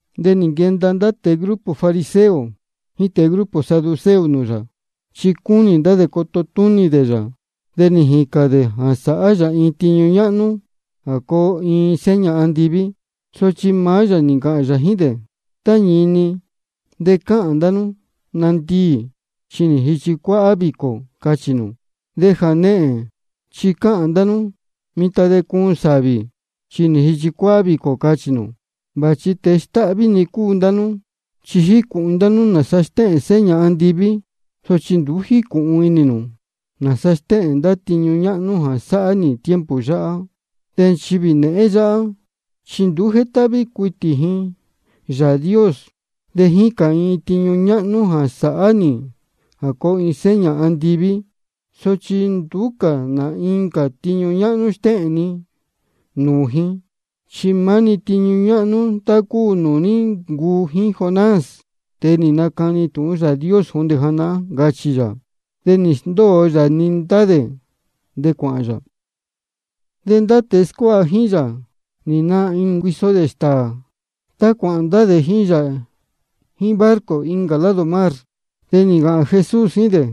De nī nquenda ndá tēe grupo fariseo jíín tēe grupo saduceo nūū yā. Chi cúnī ndá dē coto túnī dē yā, de nī jīcān dē jā sāhá yā iin tiñu ñáhnú jā coo iin seña andiví. Sochi maá yā nī ncāhān yā jíín dē: Tá ñini, de cáhān ndá nú: Nandiī, chi nī jīchi cuáhá vīcō, cáchī nū. De jānehēn chi cáhān ndá nú: Mitan de cuun sāvī, chi nī jīchi cuáhá vīcō, cáchī nū. Vāchi tēe stáhví-ni cúu ndá nú. Chi jícūhun inī ndá nú nāsa stéhēn seña andiví, sochi nduú jícūhun inī nū nāsa stéhēn ndá tiñu ñáhnú jā sáhá nī tiempo yáhá. De nchivī nēhén yáhá, chi nduú jétáhví cuitī ji Yāā Dios. De jícān ji iin tiñu ñáhnú jā sāhá nī jā coo iin seña andiví. Sochi nduú cā nā incā tiñu ñáhnú stéhēn ni nūū ji, chi maá-ni tiñu ñáhnú tá cúu nūū ní ncuu jíín Jonás, tēe nī nacani tūhun Yāā Dios jondē janahán, ncachī yā. De nī sndóo yā-ni ndá dē, de cuāhān yā. De ndá tēe scuáha jíín yā nī naā inī dē cuiso dē stāā tá cuāhān ndá dē jíín yā jíín barco incā lado mar. De nī ncāhān Jesús jíín dē: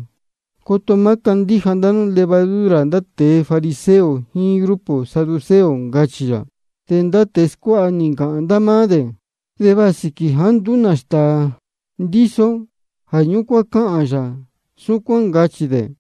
Coto má candíja ndá nú levadura ndá tēe grupo fariseo jíín grupo saduceo, ncachī yā. De ndá tēe scuáha nī ncāhān ndá máá dē: Va sīquī jāá nduú nā stāā ndíso ó, jā ñúcuán cáhān yā súcuán, ncachī dē.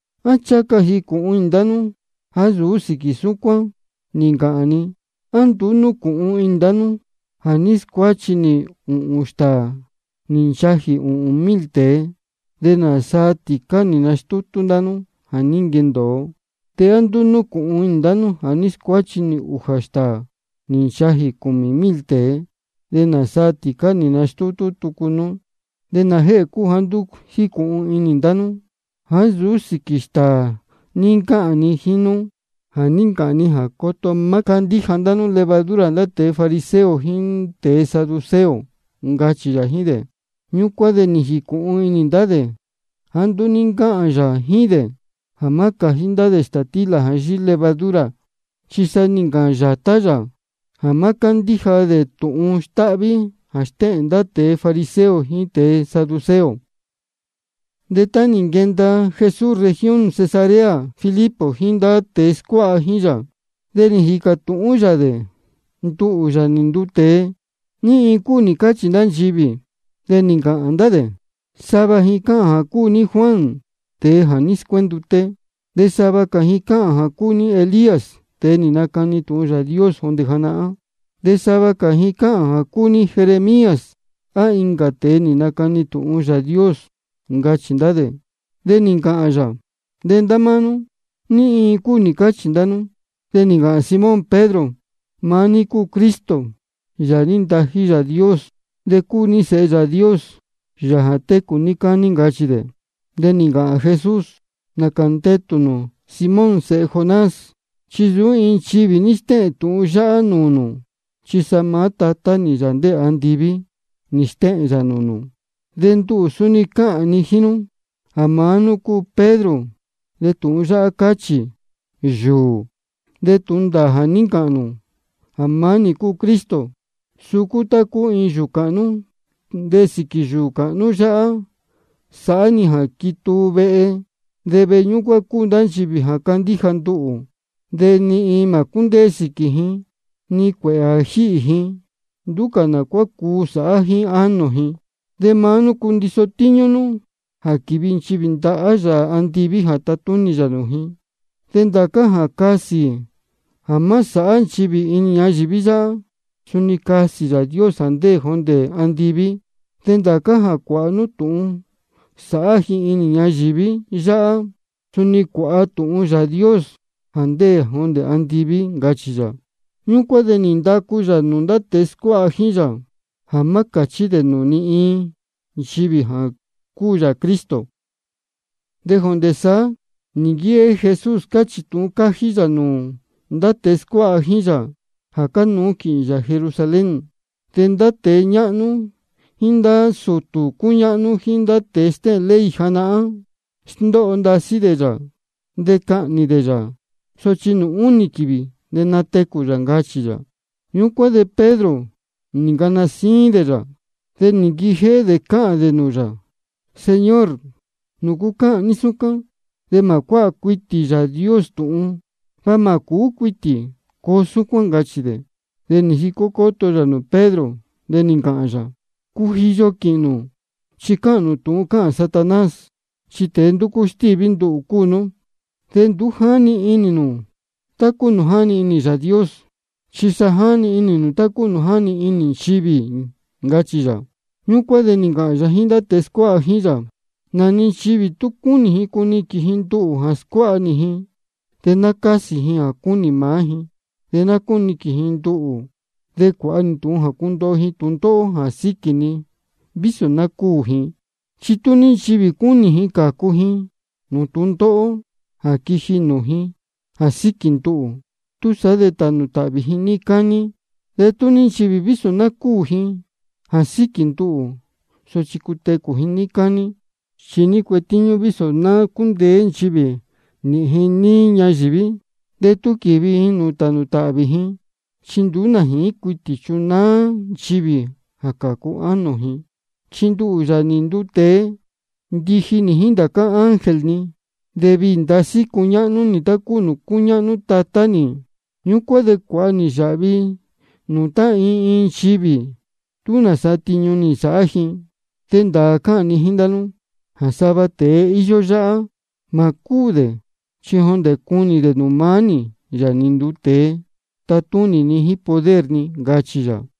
¿A ncháha ca jīcūhun inī ndá nú jāá nsūú sīquī ñúcuán ní ncáhān ni? ¿A nduú núcūhun inī nū jā ní scuáchi nī ūhūn stāā nī nchajī ūhūn mil tēe, de nāsaa tīcá nī nastútú ndá nú jā ní nquendōo? ¿De á nduú núcūhun inī nū jā ní scuáchi nī ūjā stāā nī nchajī cūmī mil tēe, de nāsaa tīcá nī nastútú tucu nú? ¿De nājēhē cúu jāá nduú jícūhun inī ndá nú jāá nsūú sīquī stāā ní ncáhān ni jíín nú jā ní ncāhān ni jā coto má candíja ndá nú levadura ndá tēe fariseo jíín tēe saduceo? ncachī yā jíín dē. Ñúcuán de nī jīcūhun inī ndá dē jāá nduú ní ncáhān yā jíín dē jā má cājí dē stātílā jā yíhí levadura, chi sa nī ncāhān yātá yā jā má cándíja dē tūhun stáhví jā stéhēn ndá tēe fariseo jíín tēe saduceo. De tá nī nquenda Jesús región Cesarea Filipo jíín ndá tēe scuáha jíín yā, de nī jīcā tūhún yā dē: Nduhū, Yāā nī nduu tēe, ¿ní iin cúu nī cáchī ndá nchivī? De nī ncāhān ndá dē: Sava ji cáhān jā cúu ní Juan, tēe jā ní scuénduté. De sava cā ji cáhān jā cúu ní Elías, tēe nī nacani tūhun Yāā Dios jondē janahán. De sava cā ji cáhān jā cúu ní Jeremías á incā tēe nī nacani tūhun Yāā Dios, ncachī ndá dē. De nī ncāhān yā: De ndá máá nú, ¿ní iin cúu nī cáchī ndá nú? De nī ncāhān Simón Pedro: Maá ní cúu Cristo, Yāā jā ní ntají Yāā Dios. De cúu ní Sēhe Yāā Dios, Yāā jā técū níí cání, ncachī dē. De nī ncāhān Jesús: Nācā ndetū nū, Simón sēhe Jonás, chi nsūú iin nchivī ní stéhēn tūhun yáhá nūū nū, chi sa maá Tatá nī, Yāā ndéē andiví, nī stéhēn yā nūū nū. De nduhū suni cáhān ni jíín nú jā maá nú cúu Pedro, de tūhun yáhá cáchī: Yūū. De tūhun ndāā jā ní ncāhān nū jā maá nī cúu Cristo, suu cúu tá cúu iin yūū cāhnú. De sīquī yūū cāhnú yáhá sāhá nī jā quituu vehe, de vehe ñúcuán cúu ndá nchivī jā cándíja nduhū. De ni iin mā cúndéé sīquī ji, ni cuēhē jā jíhī ji, nduú cā nā cuá cuu sāhá jíín ánō ji. De maá nú cundiso tíñú nú jā quīvi nchivī ndahá Yāā andiví jā tatúnī yā nūū ji. De ndācá jā casī nū jā má sāhá nchivī inī ñayīví yáhá, suni casī Yāā Dios jā ndéē jondē andiví. De ndācá jā cuāha nú tūhun sāhá ji inī ñayīví yáhá, suni cuāha tūhun Yāā Dios jā ndéē jondē andiví, ncachī yā. Ñúcuán de nī ndacu yā nūū ndá tēe scuáha jíín yā jā má cāchí dē nūū ni iin nchivī jā cúu yā Cristo. De jondē saá nī nquijéhé Jesús cáchī tūhun cájí yā nūū ndá tēe scuáha jíín yā jā cánuú quīhīn yā Jerusalén. De ndá tēe ñáhnú jíín ndá sūtū cúñáhnú jíín ndá tēe stéhēn ley janahán, sndóho ndasí dē yā. De cahnī ndá dē yā, sochi nūū únī quīvī de natecū yā, ncachī yā. Ñúcuán de Pedro nī ncana síín dē yā, de nī nquijéhé dē cáhān dē nūū yā: Señor, ¿nūcu cáhān ní súcuán? De mā cuáha cuitī Yāā Dios tūhun. Va mā cūú cuitī coo súcuán, ncachī dē. De nī jicó cóto yā nūū Pedro, de nī ncāhān yā: Cujiyo quīhīn nū, chi cáhān nū tá cáhān Satanás. Chi tēe ndúcú stíví nduhū cúu nú. De nduú jáni inī nū tá cúu nūū jáni inī Yāā Dios, chi sa jáni inī nū tá cúu nūū jáni inī nchivī, ncachī yā. Ñúcuán de nī ncāhān yā jíín ndá tēe scuáha jíín yā: Nā-ni nchivī tú cúnī ji cuniquīn ji nduhū jā scuáha nī ji, de ná cásī ji jā cúnī maá ji, de ná cúniquīn ji nduhū, de cuāha ji tūhun jā cundoho ji tūndóhó jā síquī ni, vísō ná cúū ji. Chi tú ní nchivī cúnī ji cācu ji nūū tūndóhó jā quiji nūū ji jā síquī nduhū, túsaá de tānū tāhvī ji níí cání. De tú ní nchivī vísō ná cúū ji jā síquī nduhū, sochi cutecū ji níí cání. ¿Chi ní cuetíñú vísō ná cúndeé nchivī nīhīn ji níí ñayīví, de tú quīvi ji nūū tānū tāhvī ji? Chi nduú nā jīín cuitī chunáá nchivī jā cācu ánō ji. Chi nduhū, Yāā nī nduu tēe, ndiji nī jíín ndācá ángel ni, de viī ndasí cuñáhnú nī tá cúu nūū cúñáhnú Tatá nī. Ñúcuán de cuāha nī yāhvi nūū tá iin iin nchivī tú nāsa tiñu nī nsāhá ji. De ndāā cáhān ni jíín ndá nú jā sava tēe íyó yáhá, mā cúū dē chi jondē cunī dē jā maá nī, Yāā nī nduu tēe, tatúnī ni jíín poder ni, ncachī yā.